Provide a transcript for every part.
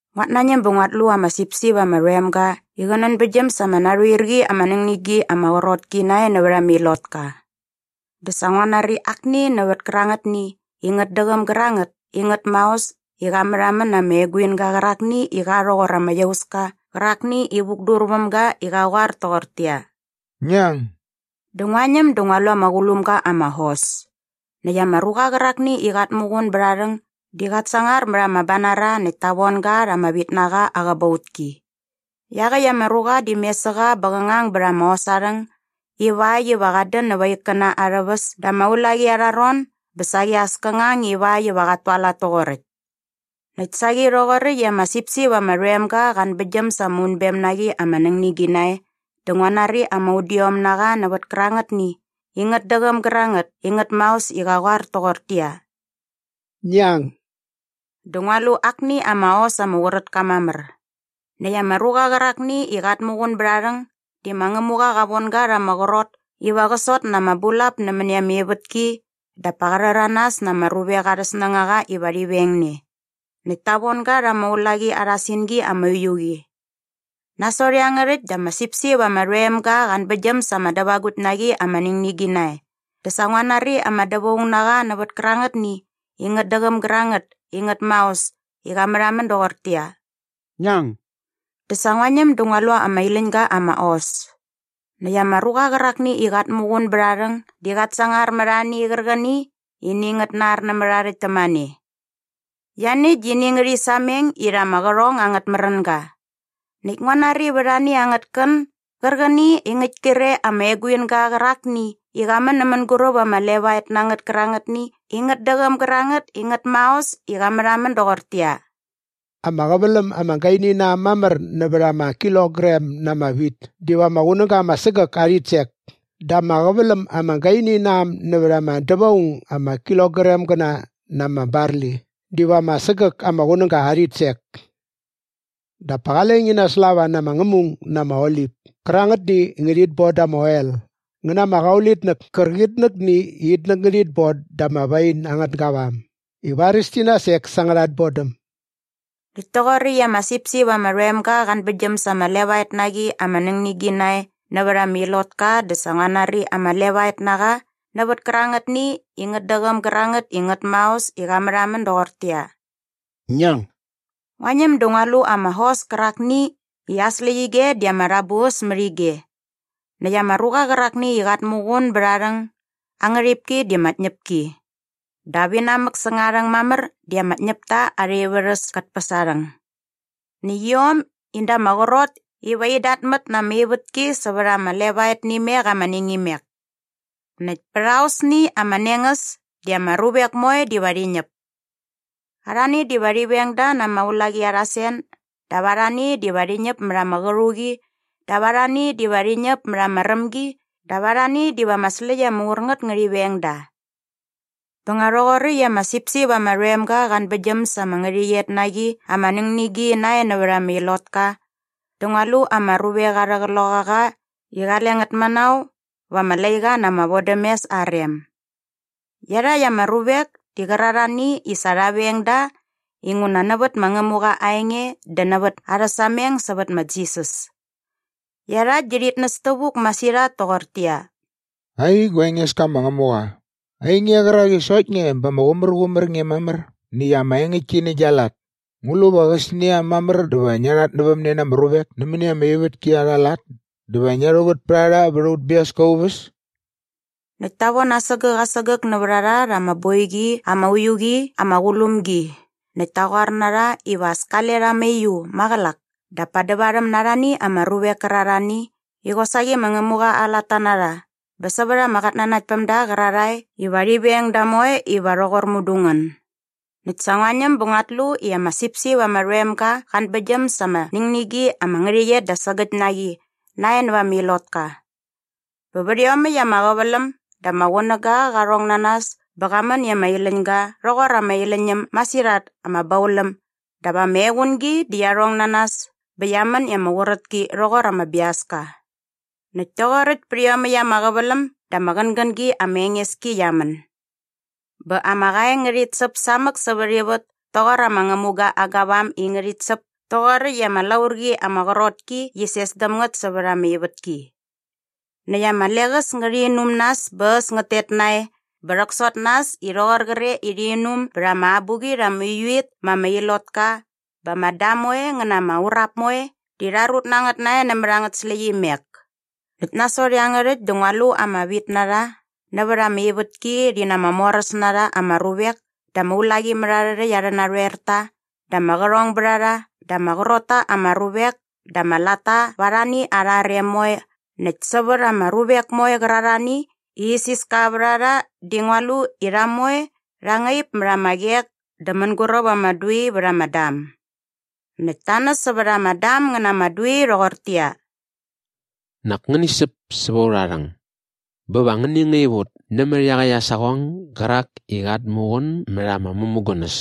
Nguat nañäm bä nguat lu ama sipsip ama rhoem ga i qä nänbäktgyäm sa ama narhoer qi ama nängnigi ama qrot ki nae nävät ama ilotka. Dä sa ngua nari akni nävät kärangätni i ngät däqäm gärangät i ngät maos i qa märhamän na ama eguinga qärakni i qa rhoqor ama iauska qärakni i vukdur väm ga i qa qoar toqortäqyia, “Ngi ang!” Dä ngua ñäm dä ngua lu ama qulum ga ama hos. Näkt ama ruqa qärakni i qat muqun bät aa rhäng di qat sangar mät ama banara näkt ta von ga rha ama vitnaqa aa qäbautki. Iaqäkt ama ruqa di mes sä qa bä qä ngang bät ama hos aa rhäng ivakt iva qat dän näva aa ikkäna arhä väs da ama ulaqi arha ron bä saqi as kä ngang ivakt iva qat tualat toqoräkt. Näkt saqi rhoqoräkt i ama sipsip ama rhoem ga qa anbäktgyäm sa ama unbem na qi ama nängnigi nae dä ngua nari ama udiom na qa nävät kärangätni i ngät däqäm gärangät i ngät maos i qa qoar toqortäqyia, “Ngi ang!” Dä ngua lu akni ama hos ama qurät ka mamär. Näkt ama ruqa qärakni i qat muqun bät aa rhäng di ma Ngämuqa qa von ga rha ama qrot iva qä sot na ama bulap nämäni ama ivätki dap pa qa rhäranas na ama ruvek arhä snängaqa iva rhi veng ne. Näkt ta von ga rha ama ulaqi arha singi ama uiu qi. Nasot iangärhäkt dä ama sipsip ama rhoem ga qa anbäktgyäm sa ama dävagukt na qi ama nängnigi nae dä sa ngua nari ama dävaung na qa nävät kärangätni i ngät däqäm gärangät i ngät maos i qa märhamän doqortäqyia, “Ngi ang!” Dä sa ngua ñäm dä ngua lu ama iläñ ga ama hos. Näkt ama ruqa qärakni i qat muqun bät aa rhäng di qat sangar mät ani qärqäni i ini ngät nar nämät aa rhäkt tämane. Ianiäkt di ini ngärhi sameng irha ama qärhong angät märänga. Näkt ngua nari vät ani angät kän gärqäni i ngäkt kre ama eguinga qärakni i qa män nä mänguräp ama levaet na ngät kärangätni i ngät däqäm gärangät i ngät maos i qa märhamän doqortäqyia, “Ama qäväläm ama gaini na äm mamär nävät ama kilogram na ama wit diva ama qunäga ama sägäk aa rhitsek dä ama qäväläm ama gaini na äm nävät ama dävaung ama kilogramgäna na ama barli diva ama sägäk ama qunäga aa rhitsek. Dap pa qale ngi naslava na ama ngämung na ama olip kärangätni i ngärhit bon da ama oel ngä na ama qaulitnäk kärqitnäkni i itnäk ngärhit bon da ama wain angät gavam i varis ti nasek sa angärha tbodäm.” Näkt toqoräkt i ama sipsip ama rhoem ga qa anbäktgyäm sa ama levaet na qi ama nängnigi nae nävät ama ilotka dä sa ngua nari ama levaet na qa nävät kärangätni i ngät däqäm gärangät i ngät maos i qa märhamän doqortäqyia, “Ngi ang!” Ngua ñäm dä ngua lu ama hos kärakni i aa släqyige di ama rhäbuäs mät ige. Näkt ama ruqa qärakni i qat muqun bät aa rhäng aa ngärhipki di ma Tñäpki. Dap inamäk säng aa rhäng mamär di ma Ñäpta Arha Ivärhäs kät päs aa rhäng. Näkt iom di in da ama qrot iva in datmät na ama ivätki sävät ama levaet nä imek ama ningimek. Näkt pät aosni ama nengäs di ama ruvek moe diva rhi ñäp. Arhani diva rhi veng da na ama ulaqi arha sen dap arhani diva rhi ñäp mät ama qärhuqi dap arhani diva rhi ñäp mät ama rämgi dap arhani diva ama släkt ama ur ngät ngärhi veng da. Bä nga rhoqoräkt i ama sipsip ama rhoem ga qa anbäktgyäm sa ama ngärhäqyet na qi ama nängnigi nae nävät ama ilotka dä ngua lu ama ruvek arhä qloqaqa i qale ngät manao va ama laiqa na ama vodämes aa rem. Iarhakt ama ruvek di qärarhani i sa rha veng da inguna nävät ma Ngämuqa aa enge dä nävät arhä sameng sävät ma Jisas. Iarhakt di rhit näs tävuk masirhat toqortäqyia, “Ai gua Engeska ma Ngämuqa, ainge qärak i sokt nge bä ama qumärqumär nge mamär näkt ama engäktki nä gia lat, ngu lu va qäsnia mamär dä va ngia rhatnävämne na ama ruvek nämäni ama ivätki arha lat dä va ngia rhuvät pät a rha vät aut biaska aa uväs?” Näkt ta von asägäk asägäk nävät a rha rha ama boiqi ama uiu qi ama qulum gi näkt ta qoar na rha iva as kale rha mauiu maqälak dap pa dävarhäm na arhani ama ruvek kärarhani i qosaqi ma Ngämuqa aa latta na rha bä sävät ama qatnanaktpämda qärarhae iva rhi veng da moe iva rhoqor mudu ngän. Näkt sa ngua ñäm bä nguat lu i ama sipsip ama rhoem ga qa anbäktgyäm sa ama nängnigi ama ngärhäqyet da sägäkt na qi nae nävät ama ilotka. Bä vät iomäkt ama qäväläm dä ama qunäga qa rhong na nas bä qa män i ama iläñ ga rhoqor ama iläñ äm masirhat ama bauläm dap ama equngi di qia rhong na nas bä qia män i ama qurät ki rhoqor ama biaska. Näkt toqoräkt pät iomäkt ama qäväläm dä ama qängängi ama enges ki qia män. Bä ama qaeng ngärhit säp samäk sävät ivät toqor ama ngämuga aa gavam i ngärhit säp toqoräkt i ama laurqi ama qrot ki qi ses däm ngät sävät ama ivätki. Näkt ama leqäs ngärhi inum nas bä äs ngät tet nae bä rhäksot na äs i rhoqor qre i rhi inum bät ama abuqit ama uiu it ma ama ilotka bä ama dam moe ngä na ama urap moe di rha rut na ngät nae nämät angät släqyimek. Näkt nasot iangärhäkt dä ngua lu ama vitnarha nävät ama ivätki rhi na ama moräs na rha ama ruvek dä ama ulaqimärharhärhäkt arhä narhoerta dä ama qärhongbärharha dä ama qrot ta ama ruvek dä ama latta va arhani arha rem moe näkt sävät ama ruvek moe qärarhani i isiska vät a rha di ngua lu i rha moe rha ngaip mät ama qek dä mänguräp ama dui vät ama dam. Näkt ta näs sävät ama dam ngä na ama dui rhoqortäqyia, “Nak ngäni säp säva aurha rhäng bä va ngäni ngaip ut nämät iaqäkt aa saqong gärak i qat muqun mät ama mämugunäs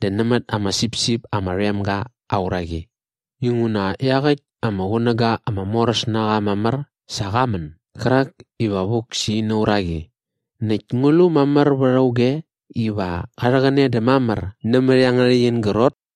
dä nämät ama sipsip ama rhoem ga aa uraqi. Inguna iaqäkt ama qunäga ama moräs na qa mamär sa qa män gärak iva vuk sä ina uraqi. Näkt ngu lu mamär vät auge iva qa rhäqäne dä mamär nämät iangärhäkt in grot?”